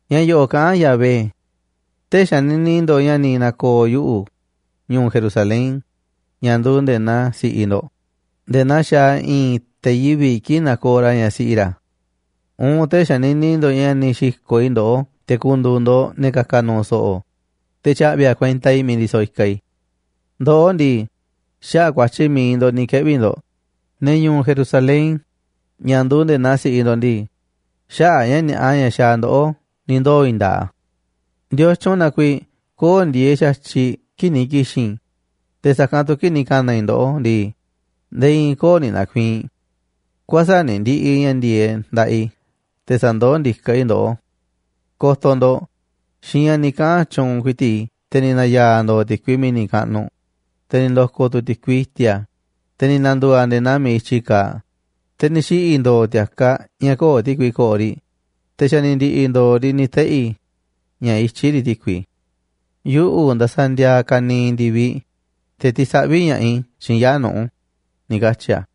Ña̱ yo̱ꞌo̱ꞌ kaꞌán Yahvé: “Tee̱ꞌ xanini ndo̱ꞌ ña̱ ni̱ na̱ko̱o̱ yuꞌu̱, ñu̱u̱ Jerusalén, ña̱ nduuꞌ nde̱e̱ naa si̱ꞌiꞌ ndo̱ꞌ, nde̱e̱ naa xaaꞌ i̱i̱n te̱ yivi̱ꞌ kii̱ꞌ nakooꞌ ra̱ ñaꞌ siꞌi ra̱. Uun tee̱ꞌ xanini ndo̱ꞌ ña̱ ni̱ xi̱ko̱ꞌ i̱ ndoꞌó te̱ ku̱ndu̱u̱ ndo̱ꞌ ne̱ ka̱ka̱ nu̱u̱ so̱ꞌo̱, te̱ tya̱ꞌvi̱ a̱ kuenta i̱ miiꞌ ndisoꞌ i̱kaꞌ i̱. Ndoꞌó ndii, xaꞌa̱ꞌ ku̱a̱tyi̱ mi̱iꞌ ndo̱ꞌ ni̱ keꞌvi̱ ndo̱ꞌ, ne̱ ñu̱u̱ Jerusalén, ña̱ nduuꞌ nde̱e̱ naa si̱ꞌiꞌ ndo̱ꞌ ndii, xaꞌa̱ꞌ ña̱ ni̱a̱ꞌa ña̱ xaaꞌ ndoꞌó ni̱ ndoo̱ i̱i̱n nda̱a̱ꞌ a̱. ¿Ndiotyun na kuiiꞌ köo̱ꞌ ndieeꞌ xa̱tyiꞌ kii̱ꞌ ni̱ ki̱xi̱n i̱, te̱ sa̱kanꞌ tu̱ kii̱ꞌ ni̱ ka̱na̱ i̱ ndoꞌó ndii, nde̱e̱ i̱i̱n köo̱ꞌ ni̱ na̱ku̱i̱i̱n? Kuäsa̱ꞌ ni̱ ndi̱ꞌi̱ ña̱ ndi̱e̱e̱ꞌ nda̱ꞌaꞌ i̱ te̱ sa̱ndoó ndiká i̱ ndoꞌó. Ko̱to̱ ndo̱ꞌ, xiinꞌ ña̱ ni̱ kaꞌa̱n tyuunꞌ ku̱i̱ti̱ꞌ i̱ te̱ ni̱ na̱ya̱a̱ ndo̱o̱ ti̱kui mi̱ni̱ kaꞌnuꞌ, te̱ ni̱ ndo̱ko̱ tu̱ ti̱kui i̱ti̱a̱, te̱ ni̱ na̱ndu̱u̱ a̱ nde̱e̱ naa miiꞌ i̱tyi kaaꞌ, te̱ ni̱ xiꞌi̱ ndo̱o̱ ti̱a̱kaꞌ ña̱ köo̱ꞌ ti̱kui ko̱ꞌo̱ riꞌ, te̱ xa̱ ni̱ ndi̱ꞌi̱ ndo̱o̱ riꞌ ni̱ teꞌi̱, ña̱ ityí riꞌ ti̱kui. Yuꞌu̱ ndasaꞌ ndiaaꞌ ka̱niiꞌ ndi̱viꞌ, te̱ tisaꞌví ña̱ꞌaꞌ i̱ xiinꞌ yaa̱ꞌ nuꞌu̱”, ni̱ katyi̱ a̱.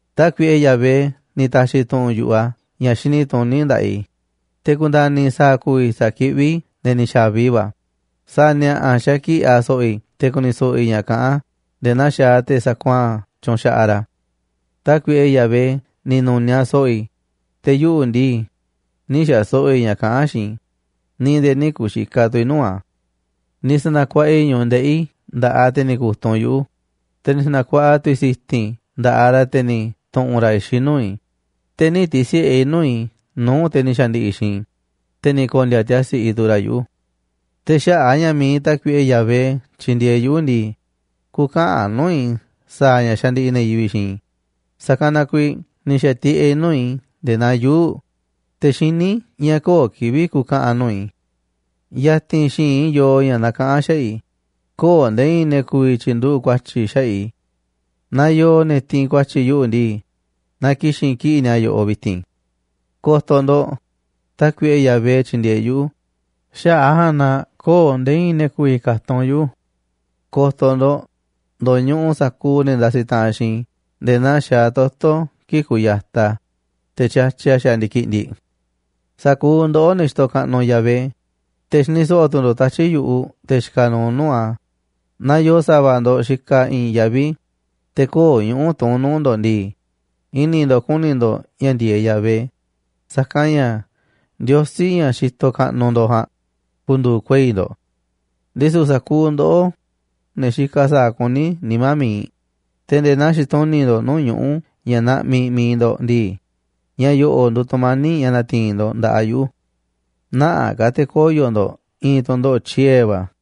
Tákuiꞌe Yahvé ni̱ ta̱xi̱ tu̱ꞌu̱n yu̱ꞌuꞌ a̱ ña̱ xini tuní nda̱ꞌaꞌ i̱, te̱ ku̱nda̱ni̱ i̱ sa̱a̱ ku̱vi̱ sa̱kiꞌví i̱ ne̱ ni̱ xa̱vi va̱. Sa̱a̱ ni̱a̱ꞌa̱ xakiꞌi̱ꞌ a̱ so̱ꞌo̱ i̱ te̱ ku̱ni̱ so̱ꞌo̱ i̱ ña̱ kaꞌán a̱ nde̱e̱ naa xaaꞌ te̱ sakuaa̱n tyunxaꞌaꞌ ra̱. Tákuiꞌe Yahvé ni̱ nu̱niaꞌ so̱ꞌo̱ i̱, te̱ yuꞌu̱ ndii, nï̱ xa̱ so̱ꞌo̱ i̱ ña̱ kaꞌán a̱ xiinꞌ i̱ ni̱ nde̱e̱ nï̱ ku̱xikaꞌ tu̱ i̱ nuu̱ꞌ a̱. Ni̱ sa̱na̱kuaꞌa i̱ ñu̱ꞌuꞌ ndeꞌi̱ i̱ nda̱ꞌaꞌ te̱ ni̱ ku̱tunꞌ yuꞌu̱, te̱ ni̱ sa̱na̱kuaꞌa tu̱ i̱ si̱ti̱n i̱ nda̱ꞌaꞌ ra̱ te̱ ni̱ tu̱ꞌu̱n ra̱ i̱xiꞌ nuu̱ꞌ i̱, te̱ nï̱ ti̱si̱ꞌe i̱ nuu̱ꞌ i̱ nuu̱ꞌ te̱ ni̱ xa̱ndi̱ꞌi̱ xiinꞌ i̱, te̱ ni̱ ko̱ndi̱a̱ tiasi̱ꞌi tu̱ ra̱ yuꞌu̱. Te̱ xaꞌa̱ꞌ a̱ ña̱ mi̱iꞌ Tákuiꞌe Yahvé tyindieeꞌ yuꞌu̱ ndii, kü̱ka̱ꞌa̱n nuu̱ꞌ i̱ sa̱a̱ ña̱ xandiꞌiꞌ ne̱ yivi̱ꞌ xiinꞌ i̱. Sa̱kanꞌ na kuiiꞌ ni̱ xa̱tiꞌeꞌ i̱ nuu̱ꞌ i̱ nde̱e̱ naa yuu̱ꞌ, te̱ xiní i̱ ña̱ köo̱ꞌ kivi̱ꞌ ku̱ka̱ꞌa̱n nuu̱ꞌ i̱. Ya̱ti̱n xi̱i̱nꞌ i̱ yoo ña̱ nakaꞌán xaꞌa̱ꞌ i̱, köo̱ꞌ nde̱e̱ i̱i̱n ne̱ ku̱vi̱ tyi̱nduꞌu̱ꞌ ku̱a̱tyi̱ xaꞌa̱ꞌ i̱. Naaꞌ yoo ne̱ tiinꞌ ku̱a̱tyi̱ yuꞌu̱ ndii, na ki̱xi̱n kiꞌi̱ꞌ ni̱a̱ yoꞌoꞌ vi̱ti̱n. Ko̱to̱ ndo̱ꞌ, Tákuiꞌe Yahvé tyindieeꞌ yuꞌu̱, xaꞌa̱ꞌ a̱ ja̱a̱nꞌ na köo̱ꞌ nde̱e̱ i̱i̱n ne̱ ku̱vi̱ ka̱tunꞌ yuꞌu̱. Ko̱to̱ ndo̱ꞌ, ndo̱ñuꞌuꞌ sa̱kuuꞌ ne̱ ndasiꞌ taꞌanꞌ xiinꞌ i̱ nde̱e̱ naa xaaꞌ toto̱ kii̱ꞌ kuyataꞌ a̱, te̱ tyatyiꞌ a̱ xaaꞌ ndi̱kiꞌndiꞌ. Sa̱kuuꞌ ndoꞌó, ne̱ xitoꞌ kaꞌnuꞌ Yahvé, te̱ xini so̱ꞌo̱ tu̱ ndo̱ꞌ tatyi̱ꞌ yu̱ꞌuꞌ te̱ xikaꞌ nuuꞌ nuu̱ꞌ a̱. Naaꞌ yoo sa̱va̱ ndo̱ꞌ xikaꞌ i̱i̱n yaví, te̱ köo̱ꞌ ñuꞌu̱ tuún nuu̱ꞌ ndo̱ꞌ ndii, i̱ni̱ ndo̱ꞌ ku̱ni̱ ndo̱ꞌ ña̱ ndi̱e̱eꞌ Yahvé, saka̱nꞌ ña̱ Ndiosí, ña̱ xitoꞌ kaꞌnuꞌ ndo̱ꞌ ja̱a̱nꞌ, ku̱ndu̱u̱ kuei̱ ndo̱ꞌ. Ndisu̱ sa̱kuuꞌ ndoꞌó, ne̱ xikaꞌ sa̱a̱ kuní nimá mi̱iꞌ, te̱ nde̱e̱ naa xituni̱ꞌ ndo̱ꞌ nuu̱ꞌ ñuꞌu̱ ña̱ naꞌmiꞌ mi̱iꞌ ndo̱ꞌ ndii, ña̱ yo̱ꞌo̱ꞌ nduuꞌ tu̱mani̱ꞌ ña̱ na̱ti̱i̱n ndo̱ꞌ nda̱ꞌaꞌ yuꞌu̱. Nä̱ꞌaꞌ ka̱ te̱ koyo̱ ndo̱ꞌ i̱i̱n tu̱ndoꞌo̱ꞌ tyiee̱ va̱.